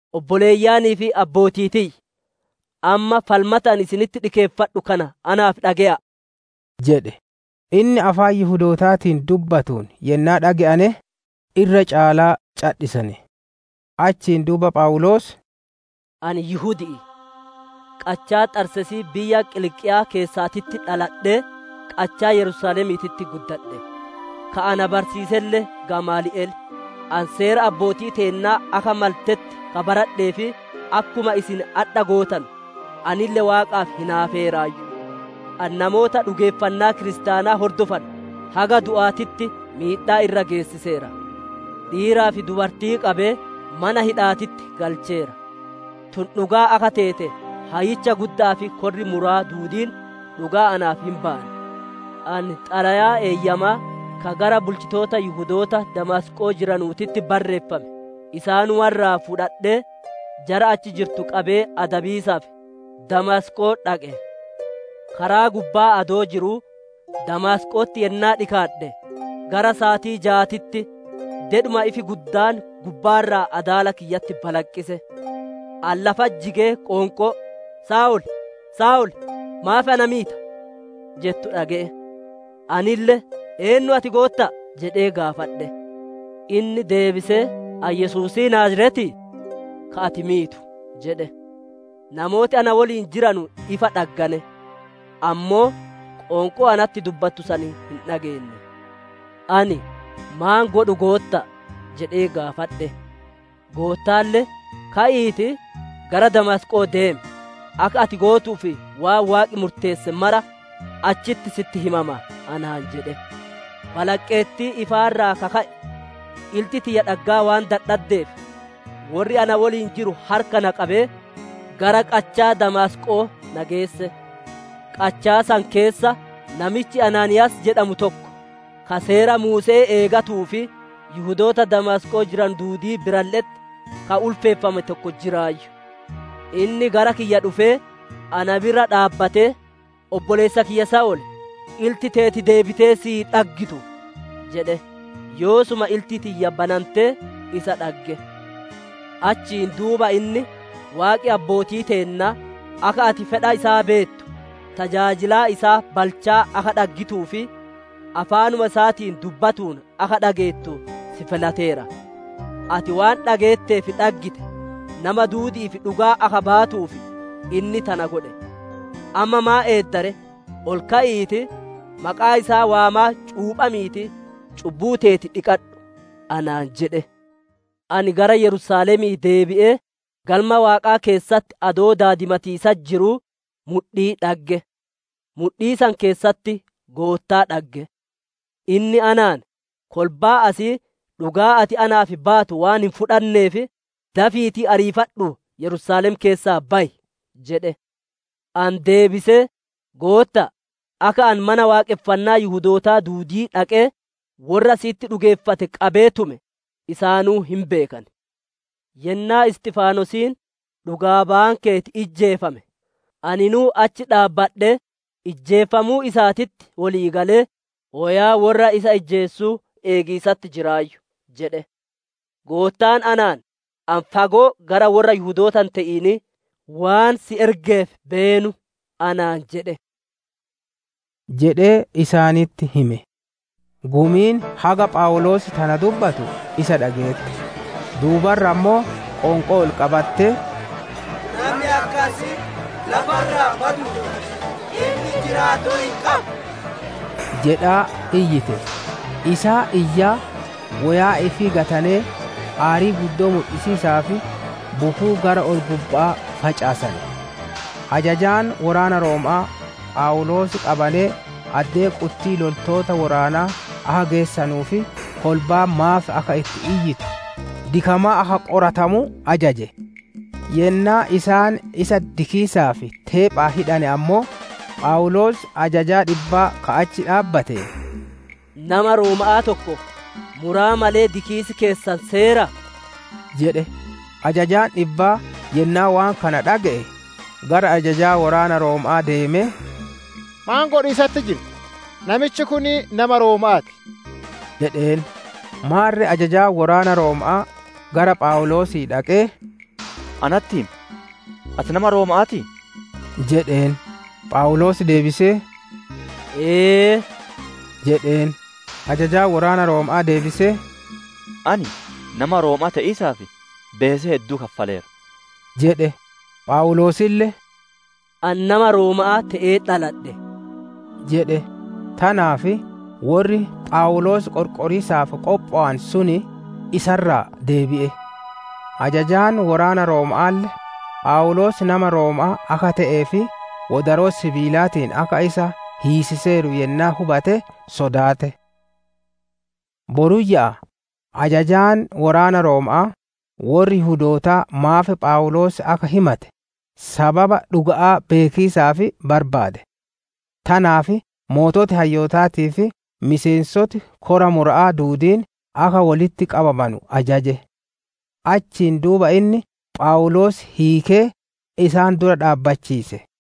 «Obboleeyyanii fi abbootii tiyya! Amma falmata ani isinitti dhikeeffadhu kana naaf dhage'a'a!» jedhe. Inni afaan Yihudootaatiin dubbatuun yennaa dhage'ane, irra caalaa cadhisane. Achiin duuba Phawuloos: «Ani Yihudi'i; qachaa Xarseesii biyya Qiliiqiyaa keessaatitti dhaladhee, qachaa Yerusaalemiititti guddadhe. Ka na barsiiselle Gamaali'el; ani Seera abbootii teennaa akka maltetti ka baradhee fi akkuma isin adhaa gootanu, anille Waaqaaf hinaafeeraayyu. Ani namoota dhugeeffannaa kiristaanaa hordofanu haga du'aatitti miidhaa irra geessiseera; dhiiraa fi dubartii qabee, mana hidha'aatitti galcheera. Tun dhugaa akka teete hayyicha gudda'aa fi korri mura'aa duudiin dhugaa naaf hin bayan. Ani xalayaa eeyyamaa ka gara bulchitoota Yihudoota Damaasqoo jiranutti barreeffame isaanuma irraa fudhadhee, jara achi jirtu qabee adabiisaaf, Damaasqoo dhaqe. «Karaa gubbaa adoo jiruu Damaasqo'otti yennaa dhikaadhe, gara saatii jaatitti dedhuma ifi guddaan gubbaa irraa adaala kiyyatti balaqqise. Ani lafatti jigee qoonqoo, ‹Saa'ol, Saa'ol! Maaf na miita?› jettu dhage'e. Anille, ‹Eennu ati Gootta'a?› jedhee gaafadhe. Inni deebisee, ‹Ani Yesuusii Naaziretii, ka ati miitu› jedhe. Namooti na woliin jiranu ifa dhaggane; ammoo qoonqoo natti dubbattu san hin dhageenne. Ani, ‹Maan godhu Gootta'a?› jedhee gaafadhe. Goottaalle, ‹Ka'iitii, gara Damaasqo'oo deem; akka ati gootuuf waan Waaqi murteesse mara, achitti sitti himama› anaan jedhe. Balaqqeettii ifaa irraa ka ka'e, ilti tiyya dhaggaa waan dadhaddeef, worri na woliin jiru harka na qabee, gara qachaa Damaasqo'oo na geesse. «Qachaa san keessa namichi Anaaniiyaas jedhamu tokko, ka Seera Muuse'ee eegatuu fi Yihudoota Damaasqoo jiranu duudii biralle'etti, ka ulfeeffame tokko jiraayyu. Inni gara kiyya dhufee, na bira dhaabbatee, ‹Obboleessa kiyya Saa'ol, ilti teeti deebitee sii dhaggitu!› jedhe. Yoosuma ilti tiyya banantee, isa dhagge. Achiin duuba inni, ‹Waaqi abbootii teennaa, akka ati fedha isaa beettu, tajaajilaa isaa balchaa akka dhaggituu fi afaanuma isaatiin dubbatuun akka dhageettu, si filateera. Ati waan dhageettee fi dhaggite, nama duudi'iif dhugaa akka baatuuf, inni tana godhe. Amma maan eedda ree? Ol ka'iitii, maqaa isaa waamaa cuuphamiitii, cubbuu teeti dhiqadhu› anaan jedhe. «Ani gara Yerusaalemii deebi'ee, Galma Waaqaa keessatti adoo daadimatiisatti jiruu, mudhii dhagge. Mudhii san keessatti Goottaa dhagge. Inni anaan, ‹Kolbaan asii dhugaa ati naaf baatu waan hin fudhanneef, dafiitii ariifadhuu Yerusaalem keessaa bayi› jedhe. Ani deebisee, ‹Gootta'a, akka ani Mana Waaqonfannaa Yihudootaa duudii dhaqee, worra si'itti dhugeeffate qabee tume, isaanuu hin beekan. Yennaa Isxifanosiin dhugaa bayaan keeti ijjeefame, aninuu achi dhaabbadhee, ijjeefamuu isaatitti wolii galee, woyaa worra isa ijjeesuu eegiisatti jiraayyu› jedhe. Goottaan anaan, ‹Ani fagoo gara worra Yihudoota hin te'inii waan si ergeef beenu› anaan jedhe» jedhee isaanitti hime. Gumiin haga Phawuloos tana dubbatu isa dhageette; duuba irra ammoo, qoonqoo ol qabattee, «Nami akkasii lafa irraa baduu ti! Inni jiraatuu hin qabu!» jedhaa iyyite. Isaan iyyaa, woyaa ifii gatanee, aarii guddoo mudhisiisaaf bukuu gara ol-gubba'aa facaasane. Ajajaan woraana Rooma'aa, Phawuloos qabanee addee quttii loltoota woraanaa akka geessanuu fi kolbaan maaf akka itti iyyitu, dikamaa akka qoratamuu ajaje. Yennaa isaan isa dikiisaaf teephaan hidhane ammoo, Phawuloos ajajaa dhibbaa ka achi dhaabbateen, «Nama Rooma'aa tokko, muraa malee dikiisi keessan seeraa?» jedhe. Ajajaan dhibbaa yennaa waan kana dhage'e, gara ajajaa woraana Rooma'aa deemee, «Maan godhiisatti jirta? Namichi kun nama Rooma'aa ti!» jedheen. Maarre ajajaan woraana Rooma'aa, gara Phawuloosii dhaqee, «Anatti himi, ati nama Rooma'aatii?» jedheen. Phawuloos deebisee, «Ee» jedheen. Ajajaan woraana Rooma'aa deebisee, «Ani nama Rooma'aa te'iisaaf, beesee hedduu kaffaleera» jedhe. Phawuloosille, «Ani nama Rooma'aa te'ee dhaladhe» jedhe. Tanaaf worri Phawuloos qorqoriisaaf qophowe sun, isa irraa deebi'e; ajajaan woraana Rooma'aalle, Phawuloos nama Rooma'aa akka te'ee fi wodaroo sibiilaatiin akka hiisiseeru yennaa hubate sodaate. Boruyya'aa, ajajaan woraana Rooma'aa, worri Yihudootaa maaf Phawuloos akka himate, sababa dhuga'aa beekiisaaf barbaade; tanaaf sooreyyiin hayyootaatii fi miseensoti kora mura'aa duudiin akka wolitti qabamanu ajaje. Achiin duuba inni Phawuloos hiikee, isaan dura dhaabbachiise.